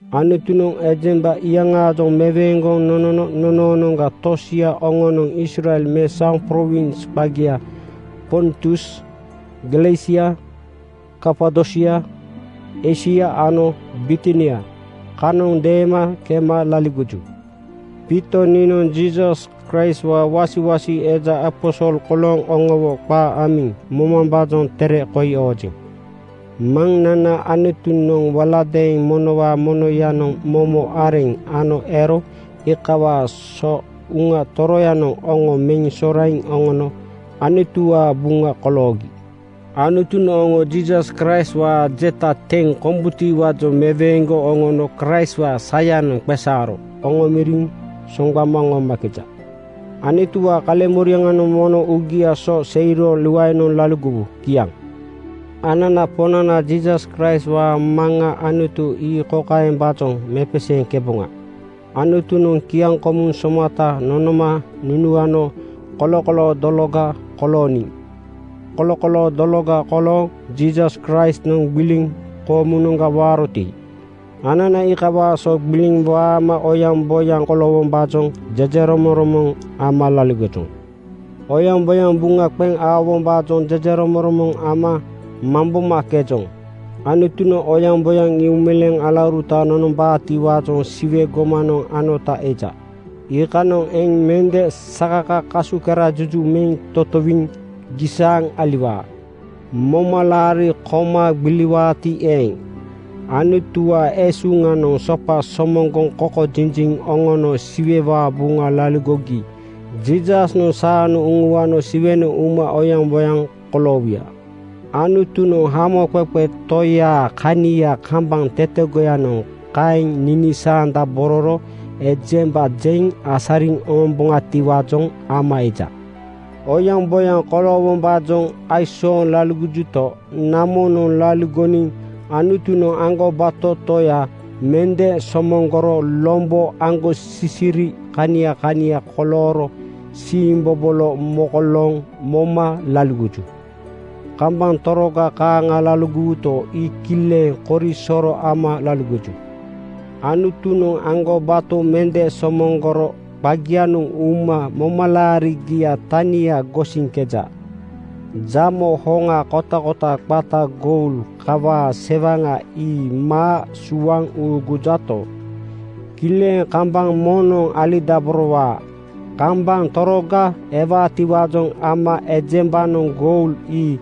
Anutunoŋ ejemba iyaŋaajoŋ meweeŋgoŋ nonono nonoonoŋga tosia oŋonoŋ Israel mesaoŋ prowins qagia Pontus, Galesia, Kapadosia, Eisia ano Bitinia kanoŋ deema kema laligoju. Piito niinoŋ Jiisas Kraistwaa wasiwasi eja aposol kolooŋ oŋowo qaa amiŋ mobombaajoŋ tere koi oojeŋ. Maŋnana Anutunoŋ waladeeŋ monowaa monoyanoŋ momo areŋ ano ero iikawaa so Uŋa Toroyanoŋ oŋo meŋ soraiŋ oŋono Anutuwaa buŋa koloogi. Anutunoŋ oŋo Jiisas Kraistwaa jeta teŋ kombutiwaajoŋ meweeŋgoŋ oŋono Kraistwaa sayanoŋ qeesaaro oŋomoriŋ soŋgbama oŋomakeja. Anutuwaa kaleŋmoriaŋanoŋ mono uugia so seiro luaenoŋ laligowu. Kiaŋ. Anana Poŋnana Jiisas Kraistwaa Maŋa Anutu ii kokaembaajoŋ mepeseeŋkeboŋa: Anutunoŋ kiaŋkomu somata nonoma nunuano kolokoloo dologa kolooniŋ. Kolokoloo dologa kolooŋ Jiisas Kraistnoŋ gbiliŋ koomunoŋga waaroti, anana iikawaa so gbiliŋ waama oyaŋboyaŋ koloowombaajoŋ jejeromoŋromoŋ ama laligojoŋ. Oyaŋboyaŋ buŋa qeŋ aowombaajoŋ jejeromoŋromoŋ ama mambomakejoŋ. Anutunoŋ oyaŋboyaŋ ii uumeleeŋ alauruta nonombaatiwaajoŋ Siwe gomanoŋ anota eja. Iikanoŋ eŋ mende sakaka kasukerajuju meŋ totowiŋ gisaaŋ aliwaa. Momalaari koma gbiliwuti eeŋ, Anutuwaa esuŋanoŋ sopa somoŋgoŋ kokojiji oŋono Siwewaa buŋa laligogi Jiisasnoŋ saanoŋ uŋuano Siwenoŋ uma oyaŋboyaŋ koloowuya. Anutunoŋ Hamoqeqe Toyaa kania kambaŋ tetegoyanoŋ kaeŋ ninisaandabororo ejemba jeŋ asariŋ oŋomboŋatiwaajoŋ ama eja. Oyaŋboyaŋ koloowombaajoŋ aisooŋ laligojuto, namonoŋ laligoniŋ Anutunoŋ aŋgobato Toya mende somoŋgoro lombo aŋgosisiri kania kania kolooro siimbobolo mokolooŋ moma laligoju. Kambaŋ toroga kaaŋa laligowuto, ii kileŋ korisoro ama laligoju. Anutunoŋ aŋgobato mende somoŋgoro qagianoŋ uma momalaarigiaa tania gosiŋkeja. Jamo hoŋa kotakota qata goul kawaa sewaŋa ii maa suaŋ uugujato, kileŋ kambaŋ moŋnoŋ alidaborowaa. Kambaŋ toroga ewaatiwaajoŋ ama ejembanoŋ goul ii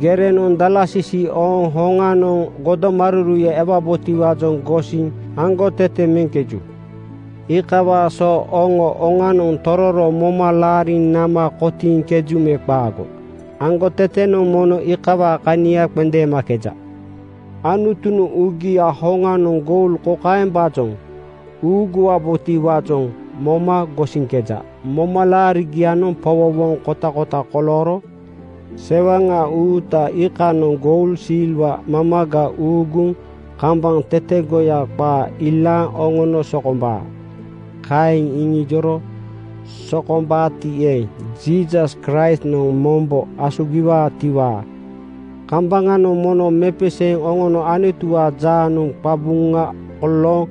gerenoŋ dalasisi ooŋ hoŋanoŋ godomaruruya ewabotiwaajoŋ gosiŋ aŋgotete meŋkeju. Iikawaa so oŋo oŋanoŋ tororo moma laariŋ nama kotiiŋkeju me qaago, aŋgotetenoŋ mono iikawaa kania qendeemakeja. Anutunoŋ uugiaa hoŋanoŋ goul kokaembaajoŋ uuguwaatiwaajoŋ moma gosiŋkeja: Momalaarigianoŋ powowoŋ kotakota kolooro sewaŋa uuta iikanoŋ goul silwa mamaga uuguŋ kambaŋ tetegoya qaa ilaaŋ oŋono sokombaa. Kaeŋ iŋiiro sokombaati eeŋ, Jiisas Kraistnoŋ mombo asugiwaatiwaa kambaŋanoŋ mono mepeseeŋ oŋono Anutuwaa jaanoŋ qabuŋa mokolooŋ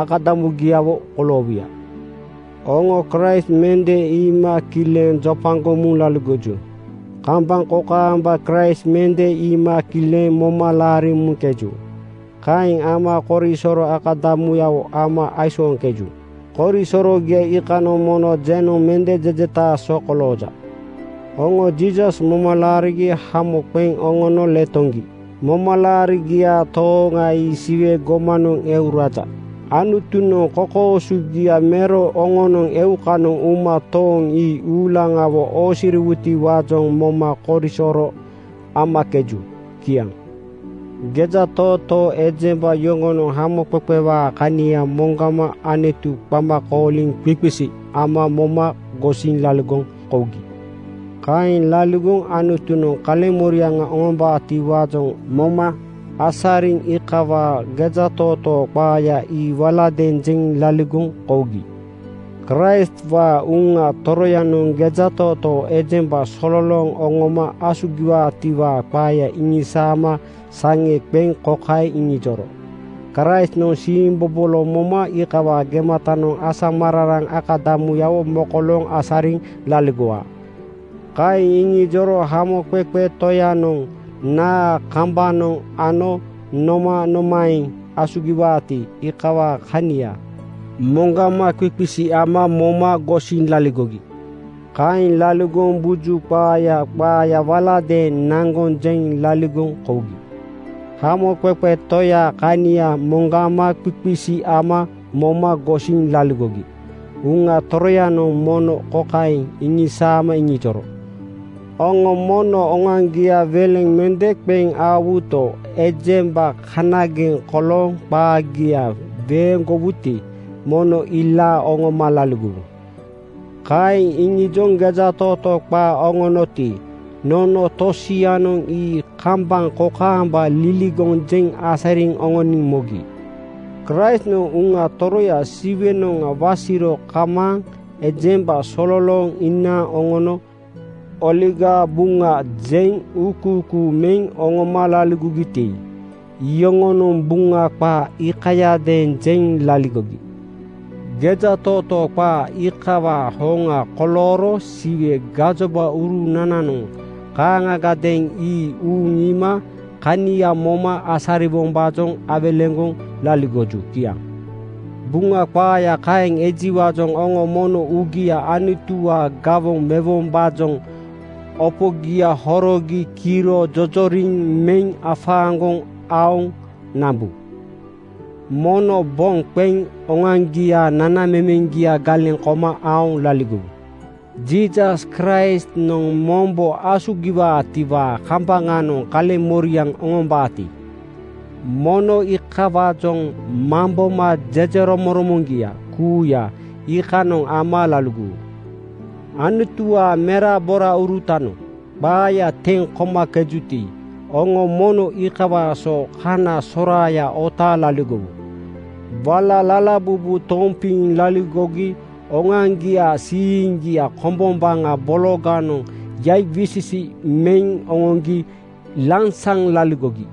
akadamugiawo koloowuya. Oŋo Kraist mende iima kileŋ jopagoŋ muŋ laligoju. Kambaŋ kokaamba Kraist mende iima kileŋ moma laariŋ muŋkeju. Kaeŋ ama korisoro akadamuyawo ama aisooŋkeju. Korisorogia iikanoŋ mono jenoŋ mende jejetaa so kolooja. Oŋo Jiisas moma laarigi hamo qeŋ oŋono letoŋgi. Momalaarigiaa tooŋa ii Siwe gomanoŋ eu raja. Anutunoŋ kokoosogia mero oŋonoŋ eukanoŋ uma tooŋ ii uulaŋawo oosiriwutiwaajoŋ moma korisoro amakeju. Kiaŋ. Gejatootoo ejemba yoŋonoŋ hamoqeqewaa kania moŋgama Anutu qama kooliŋ qiqisi ama moma gosiŋ laligoŋ kougi. Kaeŋ laligoŋ Anutunoŋ kaleŋmoriaŋ oŋombaatiwaajoŋ moma asariŋ iikawaa gejatootoo qaaya ii waladeeŋ jeŋ laligoŋ kougi. Kraistwaa Uŋa Toroyanoŋ gejatootoo ejemba sololooŋ oŋoma asugiwaatiwaa qaaya iŋisaama saŋe qeŋ kokaeŋ iŋijoro, “Kraistnoŋ siimbobolo moma iikawaa gematanoŋ asamararaŋ akadamuyawo mokolooŋ asariŋ laligowaa.” Kaeŋ iŋijoro moma Hamoqeqe Toyanoŋ naa kambanoŋ ano nomanomaeŋ asugiwaati, iikawaa kania moŋgama qiqisi ama moma gosiŋ laligogi. Kaeŋ laligoŋ buju qaaya qaaya waladeeŋ naŋgoŋ jeŋ laligoŋ kougi. Hamoqeqe Toyaa kania moŋgama qiqisi ama moma gosiŋ laligogi Uŋa Toroyanoŋ momo kokaeŋ iŋisaama iŋijoro, “Oŋo mono oŋoaŋgia weleŋ mende qeŋ aowuto, ejemba kanageŋ kolooŋ qaagia weeŋgowuti, mono ii ilaaŋ oŋoma laligowu.” Kaeŋ iŋijoŋ gejatootoo qaa oŋonoti, nono tosianoŋ ii kambaŋ kokaamba liligoŋ jeŋ asariŋ oŋoniŋ mogi. Kraistnoŋ Uŋa Toroya Siwenoŋa wasiro kamaaŋ ejemba sololooŋ inaaŋ oŋono Oligaa Buŋa jeŋ uukuukuu meŋ oŋoma laligogiti, iyoŋonoŋ Buŋa qaa iikayadeeŋ jeŋ laligogi. Gejatootoo qaa iikawaa hoŋa kolooro Siwe gajobaurunananoŋ kaaŋagadeeŋ ii uuŋ iima kania moma asariwombaajoŋ awelegoŋ laligoju. Kiaŋ. Buŋa qaaya kaeŋ ejiwaajoŋ oŋo mono uugia Anutuwaa gawoŋ mewombaajoŋ opogia horogi kiro jojoriŋ meŋ afaaŋgoŋ aoŋ nambu. Mono boŋ qeŋ oŋoaŋgiaa nanamemeŋgia galeŋ koma aoŋ laligowu. Jiisas Kraistnoŋ mombo asugiwaatiwaa kambaŋanoŋ kaleŋmoriaŋ oŋombaati, mono iikawaajoŋ mamboma jejeromoŋromoŋgia kuuya iikanoŋ ama laligowu. Anutuwaa meraboraurutanoŋ qaaya teŋ komakejuti, oŋo mono iikawaa so kana soraaya otaaŋ laligowu. Wala lalabubu tompiŋ laligogi oŋoaŋgiaa siiŋgia kombombaŋa bologanoŋ yaiwisisi meŋ oŋoŋgi lansaŋ laligogi.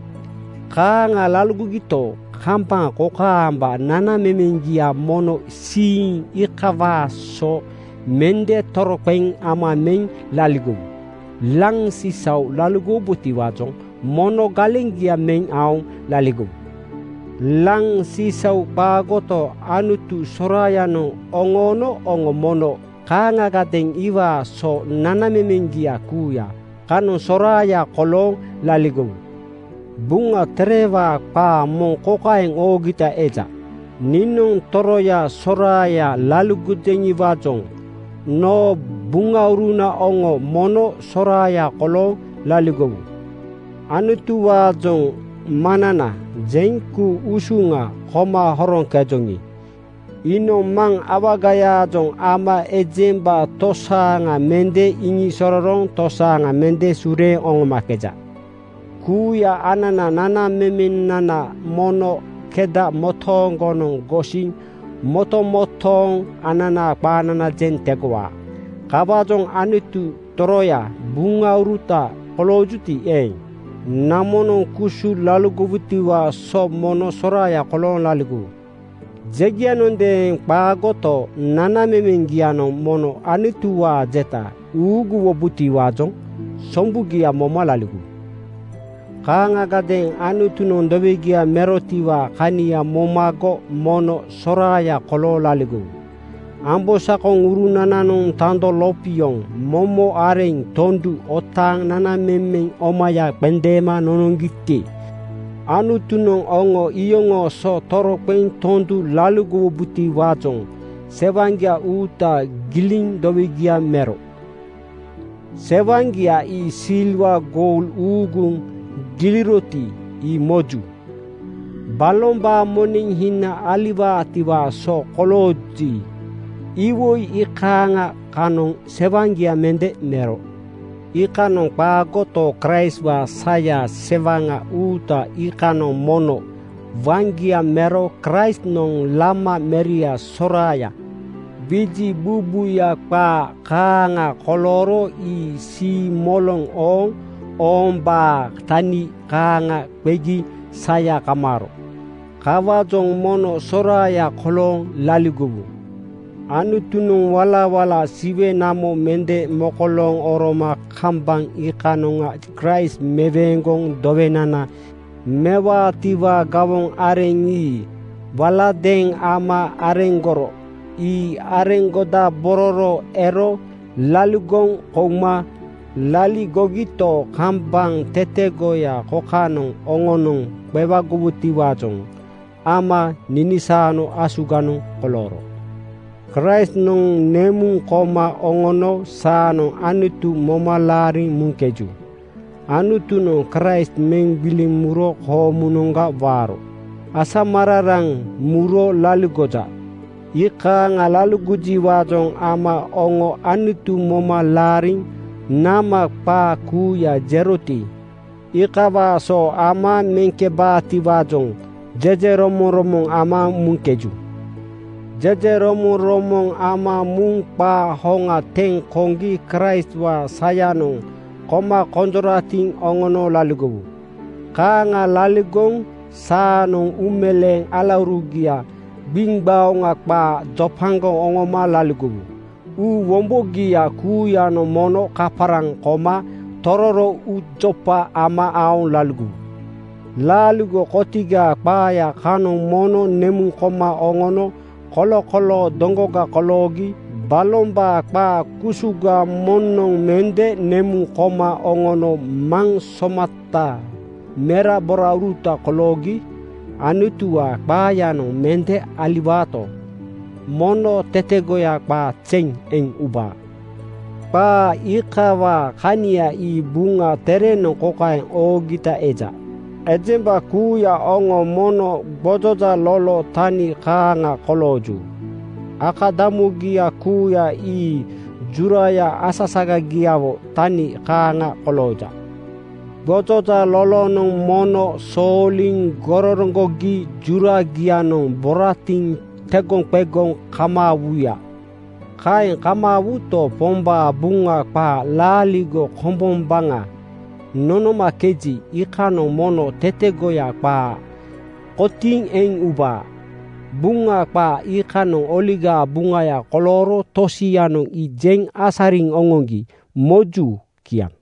Kaaŋa laligogito, kambaŋ kokaamba nanamemeŋgia mono siiŋ iikawaa so mende toroqeŋ ama meŋ laligowu. Laŋ sisau laligowubotiwaajoŋ mono galeŋgia meŋ aoŋ laligowu. Laŋ sisau qaagoto, Anutu soraayanoŋ oŋoono oŋo mono kaaŋagadeeŋ iwaa so nanamemeŋgia kuuya kanoŋ soraaya kolooŋ laligowu. Buŋa Terewaa qaa moŋ kokaeŋ oogita eja, “Niinoŋ toroya soraaya laligojeŋiwaajoŋ noo buŋauruna oŋo mono soraaya kolooŋ laligowu.” Anutuwaajoŋ “Maŋnana,” jeŋ ku-usuŋa koma horoŋkejoŋi, iinoŋ maŋ awagayaajoŋ ama ejemba tosaaŋa mende ninisorooŋ tosaaŋa mende sureeŋ oŋomakeja. Kuuya ananaa nanamemenana mono keda motooŋgonoŋ gosiŋ motomotooŋ ananaa qaanana jeŋ tegowaa. Kawaajoŋ Anutu toroyaa buŋauruta koloojuti eeŋ, namonoŋ kusu laligowutiwaa so mono soraaya kolooŋ laligowu. Jegianondeeŋ qaagoto, nanamemeŋgianoŋ mono Anutuwaa jeta uuguwombotiwaajoŋ sombugia moma laligowu. Kaaŋagadeeŋ Anutunoŋ dowegia merotiwaa kania momago mono soraaya kolooŋ laligowu. Ambosakoŋurunananoŋ tando lopioŋ momo areŋ tondu otaaŋ nanamemeŋ omaya qendeema nonoŋgiti, Anutunoŋ oŋo iyoŋoo so toroqeŋ tondu laligowubotiwaajoŋ sewaŋgia uuta giliŋ dowegia mero. Sewaŋgia ii silwa goul uuguŋ giliroti, ii moju. Balombaa moneŋ hina aliwaatiwaa so kolooji, iwoi iikaaŋa kanoŋ sewaŋgia mende mero. Iikanoŋ qaagoto, Kraistwaa saya sewaŋa uuta iikanoŋ mono waŋgia mero. Kraistnoŋ lama meria solaŋa wiji buubuuya qaa kaaŋa kolooro ii siimoloŋ ooŋ-oombaa tani kaaŋa qegi saya kamaaro. Kawaajoŋ mono soraaya kolooŋ laligowu. Anutunoŋ walawala Siwe namo mende mokolooŋ oroma kambaŋ iikanoŋa Kraist meweeŋgoŋ dowenana mewaatiwaa gawoŋ areŋ ii waladeeŋ ama areŋgoro. Ii areŋgodabororo ero laligoŋ kouma laligogito, kambaŋ tetegoya kokanoŋ oŋonoŋ qeaŋgowutiwaajoŋ ama ninisaano asuganoŋ kolooro. Kraistnoŋ nemuŋ koma oŋono saanoŋ Anutu moma laariŋ muŋkeju. Anutunoŋ Kraist meŋ gbiliŋ muro koomunoŋga waaro asamararaŋ muro laligoja. Iikaaŋa laligojiwaajoŋ ama oŋo Anutu moma laariŋ nama qaa kuuya jeroti, iikawaa so ama meŋkebaatiwaajoŋ jejeromoŋromoŋ ama muŋkeju. Jejeromoŋromoŋ ama muŋ qaa hoŋa teŋ koŋgi Kraistwaa sayanoŋ koma konjoratiŋ oŋono laligowu. Kaaŋa laligoŋ saanoŋ uumeleeŋ alaurugia gbiŋgbaoŋa qaa jopagoŋ oŋoma laligowu. Uu wombogia kuuyanoŋ mono kaparaŋ koma tororo uujopa ama aoŋ laligowu. Laaligo kotigaa qaaya kanoŋ mono nemuŋ koma oŋono kolokoloo dologa koloogi. Balombaa qaa kusuga moŋnoŋ mende nemuŋ koma oŋono Maŋ somataa meraborauruta koloogi. Anutuwaa qaayanoŋ mende aliwaato, mono tetegoya qaa zeŋ eŋ ubaa. Qaa iikawaa kania ii Buŋa Terenoŋ kokaeŋ oogita eja: “Ejemba kuuya oŋo mono gbojoja lolo tani kaaŋa kolooju. Akadamugia kuuya ii juraya asasagagiawo tani kaaŋa kolooja. Gbojoja lolonoŋ mono sooliŋ gororoŋgogi juragianoŋ boratiŋ tegoqegoŋ kamaawuya. Kaeŋ kamaawuto, Pombaa Buŋa qaa laaligo kombombaŋa nonomakeji, iikanoŋ mono tetegoya qaa kotiiŋ eŋ ubaa.” Buŋa qaa iikanoŋ Oligaa Buŋaya kolooro tosianoŋ ii jeŋ asariŋ oŋoŋgi moju. Kiaŋ.